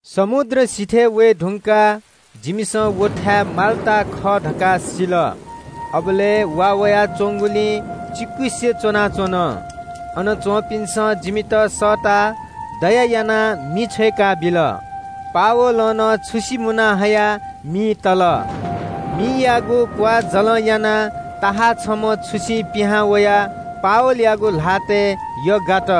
समुद्र सिथय् वये धुंकाः जिमिसं व टापु माल्‍टा खः धकाः सिल। अबलय् वा वयाच्‍वंगुलिं चिकुसे च्‍वनाच्‍वन। अन च्‍वंपिन्‍सं जिमित सःताः दया यानाः मि छ्वय्‌काबिल। पावलं नं छुसि मुना हयाः मिइ तल। मियागु क्‍वाःजलं यानाः बिख दुम्‍ह सर्प छम्‍ह छुसिं पिहां वयाः पावलयागु ल्‍हातय् यग्‍गात।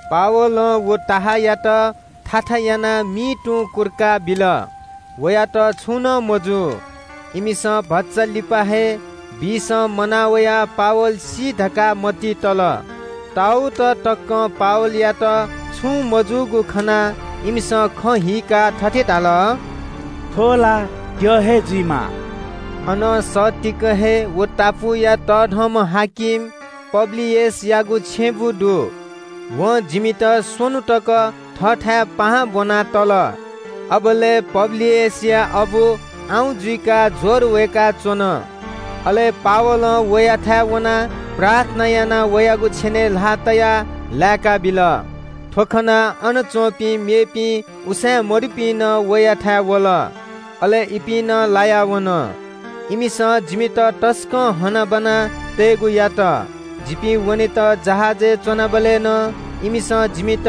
पावलं व सर्पयात थाथा यानाः मिइ तुं कुर्का बिल। वयात छुं नं मजू। इमिसं भचा लिपा हे बिषं मनावयाः पावल सी धकाः मतिइ तल। ताउत तकं पावलयात छुं मजूगु खनाः इमिसं खँ हीकाः थथे धाल – “थ्‍व ला द्यः हे जुइमाः।” अनं सत्तीक हे व टापुया तःधंम्‍ह हाकिम पब्‍लियसयागु छेँबुँ दु। वं जिमित स्‍वन्‍हु तक थःथाय् पाहां ब्‍वना तल। अबलय् पब्‍लियसया अबु आउँ जुइकाः ज्‍वर वय्‌काच्‍वन। अले पावलं वयाथाय् वनाः प्रार्थना यानाः वयागु छेनय् ल्‍हाः तयाः लाय्‌काबिल। थ्‍व खनाः अन च्‍वंपिं मेपिं उसाँय्‌मदुपिं नं वयाथाय् वल। अले इपिं नं लाया वन। इमिसं जिमित तसकं हनाबना तयेगु यात। जिपिं वनेत जहाजय् च्‍वनाबलय् नं इमिसं जिमित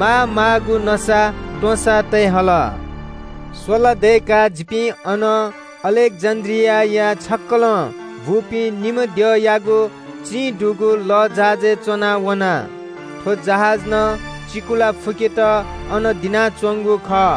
मामाःगु नसात्‍वँसा तये हल। स्‍वला दय्‌काः जिपिं अनं छक्‍कलं बूपिं निम्‍ह द्यःयागु चिं दुगु अलेक्‍जेन्‍ड्रियां वःगु लःजहाजय् च्‍वनाः वना। थ्‍व जहाज नं चिकुला फुकेत अन दिनाच्‍वंगु खः।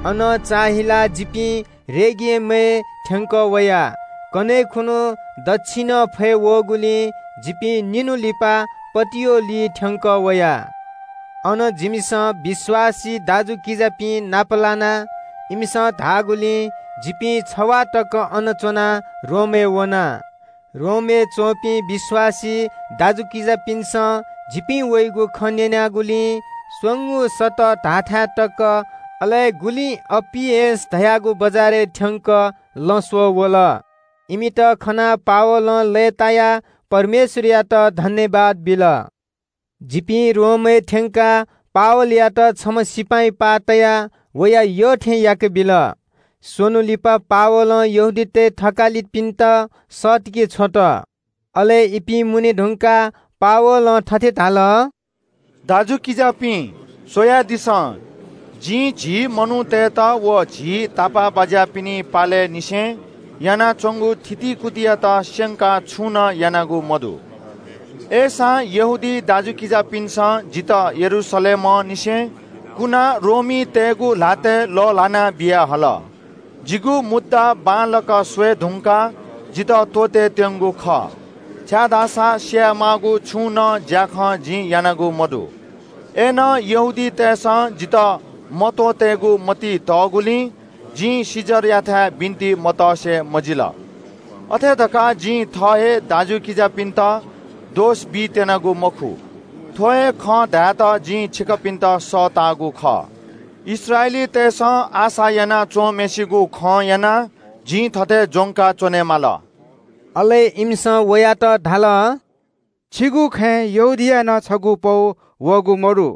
अनं जिपिं रेगियनय् थ्‍यंकः वया। कन्‍हय् खुन्‍हु दच्‍छिनं फय् वःगुलिं जिपिं निन्‍हु लिपा पटिओलिइ थ्‍यंकः वया। अन जिमिसं विश्‍वासी दाजुकिजापिं नापलाना। इमिसं इनाप याःगुलिं जिपिं छवाः तक अन च्‍वनाः रोमय् वना। रोमय् च्‍वंपिं विश्‍वासी दाजुकिजापिन्‍सं जिपिं वइगु खँ न्‍यनाः गुलिं “स्‍वंगू सतः” धाःथाय् तक, अले गुलिं “अप्‍पियस” धाःगु बजारय् थ्‍यंक लँ स्‍वः वल। इमित खनाः पावलं लय्‌तायाः परमेश्‍वरयात सुभाय् बिल। जिपिं रोमय् थ्‍यंकाः पावलयात छम्‍ह सिपाइँ पाः तयाः वया यत्‍थे याकेबिल। स्‍वन्‍हु लिपा पावलं यहूदीतय् थकालिपिन्‍त सःतके छ्वल। अले इपिं मुने धुंकाः पावलं थथे धाल – “दाजुकिजापिं, स्‍वयादिसँ, जिं झी मनूतय्‌त व झी तापाःबाज्‍यापिनि पालय् निसें यानाच्‍वंगु थितिकुतियात स्‍यंकाः छुं नं यानागु मदु। अय्‌सां यहूदी दाजुकिजापिन्‍सं जितः यरूशलेमंनिसें कुनाः रोमीतय्‌गु ल्‍हातय् लःल्‍हाना बियाहल। जिगु मुद्दा बांलाक स्‍वये धुंकाः इमिसं जितः त्‍वःतेत्‍यंगु खः, छाय्‌धाःसा स्‍याये माःगु छुं नं ज्‍याखँ जिं यानागु मदु। अय्‌नं यहूदीतय् नायःतय्‌सं जितः मत्‍वःतेगु मतिइ तःगुलिं जिं कैसरयाथाय् बिन्‍ति मतसे मजिल। अथे धकाः जिं थः हे दाजुकिजापिन्‍त दोष बीत्‍यनागु मखु। थ्‍व हे खँ धायेत जिं छिकपिन्‍त सःतागु खः। इस्राएलीतय्‌सं आशा याना च्‍वंम्‍हय्‌सिगु खं यानाः जि थथे ज्‍वंका च्‍वनेमाल।” अले इमिसं वयात धाल – “छिगु खँय् यहूदियां नं छगू पौ वःगु मदु।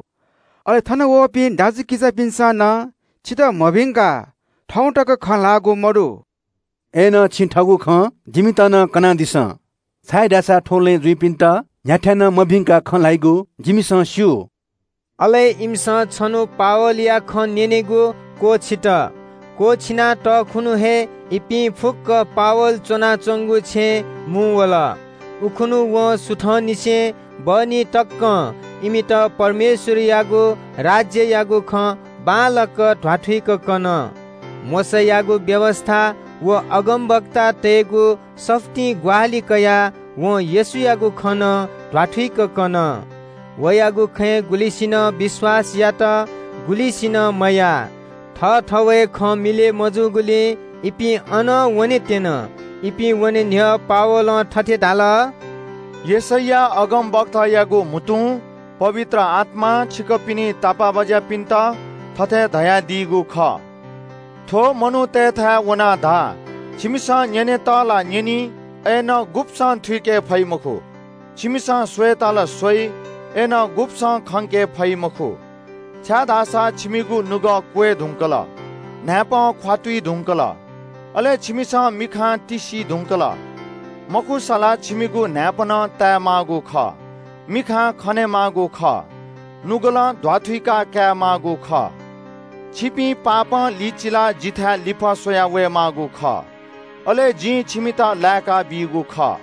अले थन वःपिं दाजुकिजापिन्‍सं नं छितः मभिंकाः थौं तक खँ ल्‍हाःगु मदु। अय्‌नं छिं थःगु खँ जिमित नं कनादिसँ, छाय्‌धाःसा थ्‍व लँय् जुइपिन्‍त न्‍ह्याथाय् नं मभिंकाः खँ ल्‍हाइगु जिमिसं स्‍यू।” अले इमिसं छन्‍हु पावलया खँ न्‍यनेगु क्‍वःछित। क्‍वःछिना तःखुन्‍हु हे इपिं फुक्‍क पावल च्‍वनाच्‍वंगु छेँय् मुंवल। उखुन्‍हु वं सुथंनिसें बहनी तकं इमित परमेश्‍वरयागु राज्‍ययागु खँ बांलाक ध्‍वाथुइक कन। मोशायागु व्‍यवस्‍था व अगमवक्तातय्‌गु सफुलिं ग्‍वाहालि कयाः वं येशूयागु खँ नं ध्‍वाथुइक कन। वयागु खँय् गुलिसिनं विश्‍वास यात, गुलिसिनं मयाः। थःथवय् खँ मिलय् मजूगुलिं इपिं अनं वनेत्‍यन। इपिं वने न्‍ह्यः पावलं थथे धाल – “यशैया अगमवक्तायागु म्‍हुतुं पवित्र आत्‍मां छिकपिनि तापाःबाज्‍यापिन्‍त थथे धयादीगु खःगु हे खँ खः – “‘थुपिं मनूतय्‌त वनाः धा – छिमिसं न्‍यनेत ला न्‍यनी, अय्‌नं गुब्‍सं थुइके फइ मखु। छिमिसं स्‍वयेत ला स्‍वइ, अय्‌नं गुब्‍सं खंके फइ मखु। छाय्‌धाःसा थुमिगु नुगः छाय् धुंकल, न्‍हाय्‌पं ख्‍वातुइ धुंकल, अले थुमिसं मिखा तिस्‍सी धुंकल। मखुसा ला थुमिगु न्‍हाय्‌पनं ताये माःगु खः, मिखां खने माःगु खः, नुगलं ध्‍वाथुइका काये माःगु खः। थुपिं पापं लिचिलाः जिथाय् लिफः स्‍वया वये माःगु खः। अले जिं थुमित लाय्‌काबीगु खः।’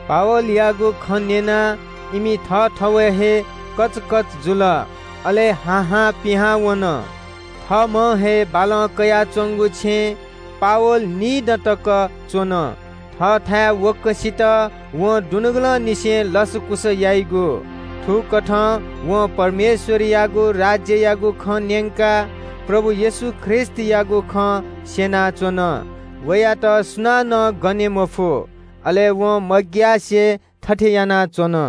वयागु खँ न्‍यनाः इमि थःथवय् हे कचकच जुल, अले हा हां पिहां वन। थःम्‍हं हे बालं कयाच्‍वंगु छेँय् पावल निदँ तक च्‍वन। थःथाय् वक्‍वसित वं दुनुगलंनिसें लसकुस याइगु। थुकथं वं परमेश्‍वरयागु राज्‍ययागु खँ न्‍यंकाः प्रभु येशू ख्रीष्‍टयागु खँ स्‍यनाच्‍वन। वयात सुनानं पने मफु, अले वं मग्‍यासे थथे यानाच्‍वन।